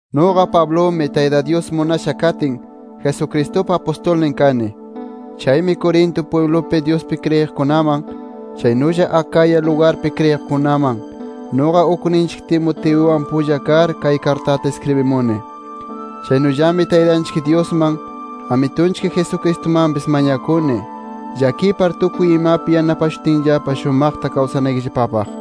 Nuqa Pablumi, Tayta Dyus munasha katin, Jesucristupa apustulnin kani. Chaymi Corinto pwiblupi Dyuspi kriyiqkunaman, chaynulla Acaya lugarpi kriyiqkunaman, nuqa ukninchik Timoteuwan pulla kar, kay kartata iskribimuni. Chaynullami Taytanchik Dyusman, Amitunchik Jesucristumanpis mañakuni, llakipar tukuy imapi yanapashutinllapa shumaqta kawsanaykillapapaq.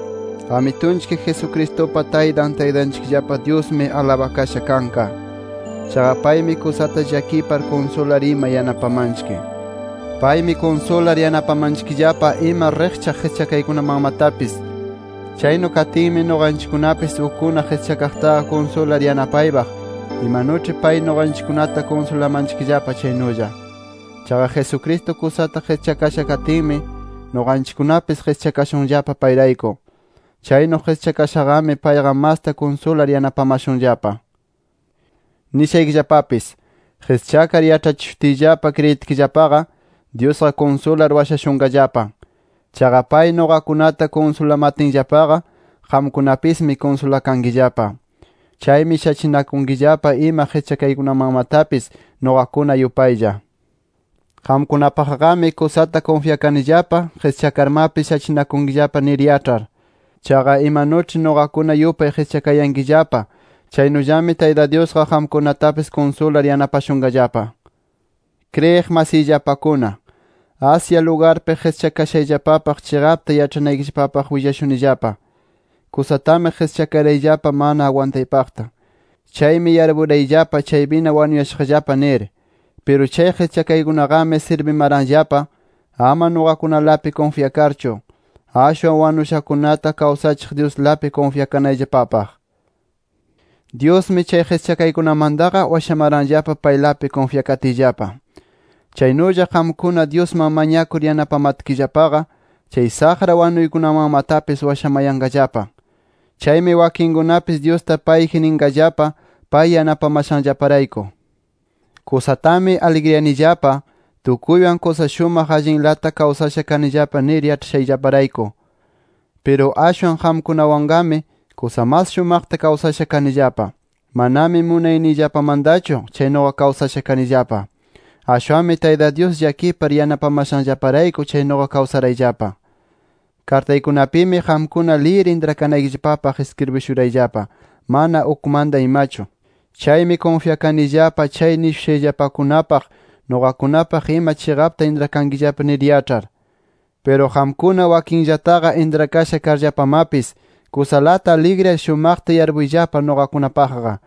Amitunchik Jesucristupa Taytan, Taytanchikllapa Dyusmi, alabakasha kanqa. Chaqa paymi kusata llakipar, kunsular ima yanapamanchikllapa. Paymi kunsular yanapamanchikllapa ima riqchaq qischakaykunamanmatapis. Chaynu katinmi, nuqanchikkunapis ukkuna qischakaqtaqa kunsular yanapaypaq, imanuĉhi pay nuqanchikkunata kunsulamanchikllapa chaynulla. Chaqa Jesucristo kusata qischakasha katinmi, nuqanchikkunapis qischakashunllapa payrayku. Chaynu qischakashaqami, payqa masta kunsular yanapamashunllapa. Nishaykillapapis, qischakar yaĉhachishutiyllapa kriyitkillapaqa, Dyusqa kunsular washashunqallapa. Chaqa pay nuqakunata kunsulamatinllapaqa, qamkunapismi kunsulakankillapa. Chaymi shachinakunkillapa ima qischakaykunamanmatapis nuqakuna yupaylla. Qamkunapaqqami, kusata kunfyakanillapa qischakarmapis shachinakunkillapa nir yaĉhar. Chaqa imanuĉhi nuqakuna yupay qischakayankillapa, chaynullami Tayta Dyusqa qamkunatapis kunsular yanapashunqallapa. Kriyiq masiyllapakuna, Asia lugarpi qischakashayllapapaq chiqapta yaĉhanaykillapapaq willashunillapa. Kusatami qischakarayllapa mana agwantaypaqta. Chaymi yarpurayllapa chaypina wanuyashaqllapa nir. Piru chay qischakaykunaqami sirbimaranllapa ama nuqakunalapi kunfyakarchu, ashwan wanushakunata kawsachiq Dyuslapi kunfyakanayllapapaq. Dyusmi chay qischakaykunamantaqa washamaranllapa paylapi kunfyakatiyllapa. Chaynulla qamkuna, Dyusman mañakur yanapamatkillapaqa, chay saqra wanunaykunamanmatapis washamayanqallapa. Chaymi wakinkunapis Dyusta payji ninqallapa pay yanapamashanllaparayku. Kusatami aligriyanillapa, tukuywan kusa shumaq allinlata kawsasha kanillapa nir yaĉhashayllaparayku. Piru ashwan qamkunawanmaqami kusa mas shumaqta kawsasha kanillapa. Manami munayniyllapamantachu chaynuqa kawsasha kanillapa. Ashwanmi Tayta Dyus llakipar yanapamashanllaparayku, chaynuqa kawsarayllapa. Kartaykunapimi qamkuna liyir intrakanaykillapapaq iskribishurayllapa, mana ukmanta imachu. Chaymi kunfyakanillapa chay nishushayllapakunapaq, nuqakunapaq ima chiqapta intrakankillapa nir yaĉhar. Piru qamkuna wakinllataqa intrakasha karllapamapis, kusalata aligriyar shumaqta yarpuyllapa nuqakunapaqqa.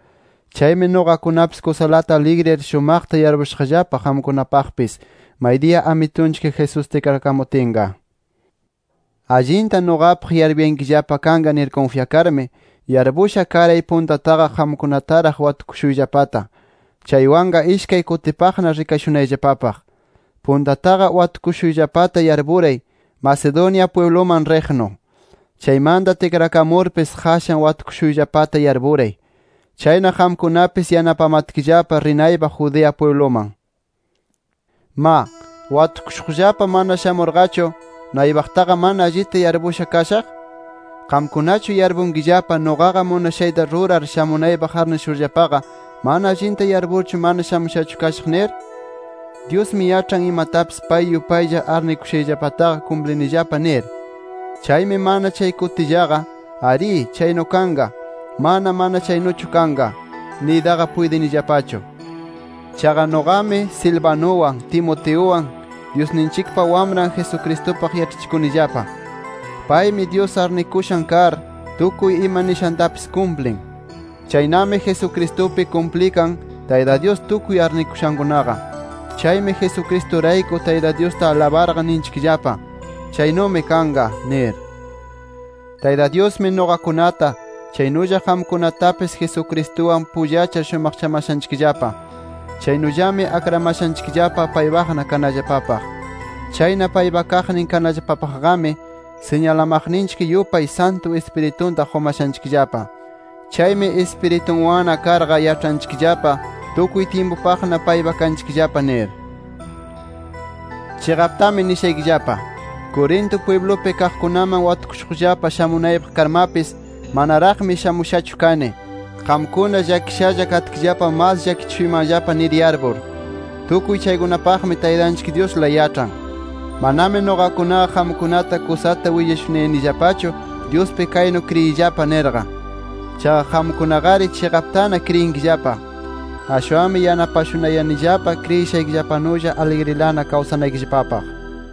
Chaymi nuqakunapis kusalata aligriyar shumaqta yarpushaqllapa qamkunapaqpis, maydiya Amitunchik Jesús tikrakamutinqa. Allinta nuqapaq yarpuyankillapa kanqa nir kunfyakarmi, yarpusha karay puntataqa qamkunataraq watukushuyllapata, chaywanqa ishkay kutipaqna rikashunayllapapaq. Puntataqa watukushuyllapata yarpuray, Macedonia pwibluman riqnu. Chaymanta tikrakamurpis qashan watukushuyllapata yarpuray. Chayna qamkunapis yanapamatkillapa rinaypaq Judea pwibluman. Ma ¿watukushuqllapa mana shamurqachu, naypaqtaqa mana allita yarpusha kashaq? ¿Qamkunachu yarpunkillapa nuqaqa munashayta rurar shamunaypaq arnishurllapaqa, mana allinta yarpurchu mana shamushachu kashaq nir? Dyusmi yaĉhan imatapis pay yupaylla arnikushayllapataqa kumplinillapa nir. Chaymi mana chay kutillaqa “Arí, chaynu kanqa”, “Mana, mana chaynuchu kanqa” niytaqa puytinillapachu. Chaqa nuqami, Silvanuwan, Timoteuwan, Dyusninchikpa Wamran Jesucristupaq yaĉhachikunillapa. Paymi Dyus arnikushan kar, tukuy ima nishantapis kumplin. Chaynami Jesucristupi kumplikan Tayta Dyus tukuy arnikushankunaqa. Chaymi Jesucristurayku, Tayta Dyusta alabarqa ninchikllapa, “Chaynumi kanqa” nir. Tayta Dyusmi nuqakunata, chaynulla qamkunatapis Jesucristuwan pullachar shumaqchamashanchikllapa. Chaynullami akramashanchikllapa paypaqna kanallapapaq. Chayna paypa kaqnin kanallapapaqqami siñalamaqninchik yupay, Santu Ispiritunta qumashanchikllapa. Chaymi Ispiritunwanna karqa, yaĉhanchikllapa tukuy tyimpupaqna paypa kanchikllapa nir. Chiqaptami nishaykillapa: Corinto pwiblupi kaqkunaman watukushuqllapa shamunaypaq karmapis, manaraqmi shamushachu kani, qamkuna llakishalla katkillapa mas llakichishuymanllapa nir yarpur. Tukuy chaykunapaqmi, Taytanchik Dyusla yaĉhan. Manami nuqakunaqa qamkunata kusata willashunayanillapachu, Dyuspi kaynu kriyiyllapa nirqa. Chaqa qamkunaqari chiqaptana kriyinkillapa. Ashwanmi yanapashunayanillapa kriyishaykillapanulla aligrilana kawsanaykillapapaq.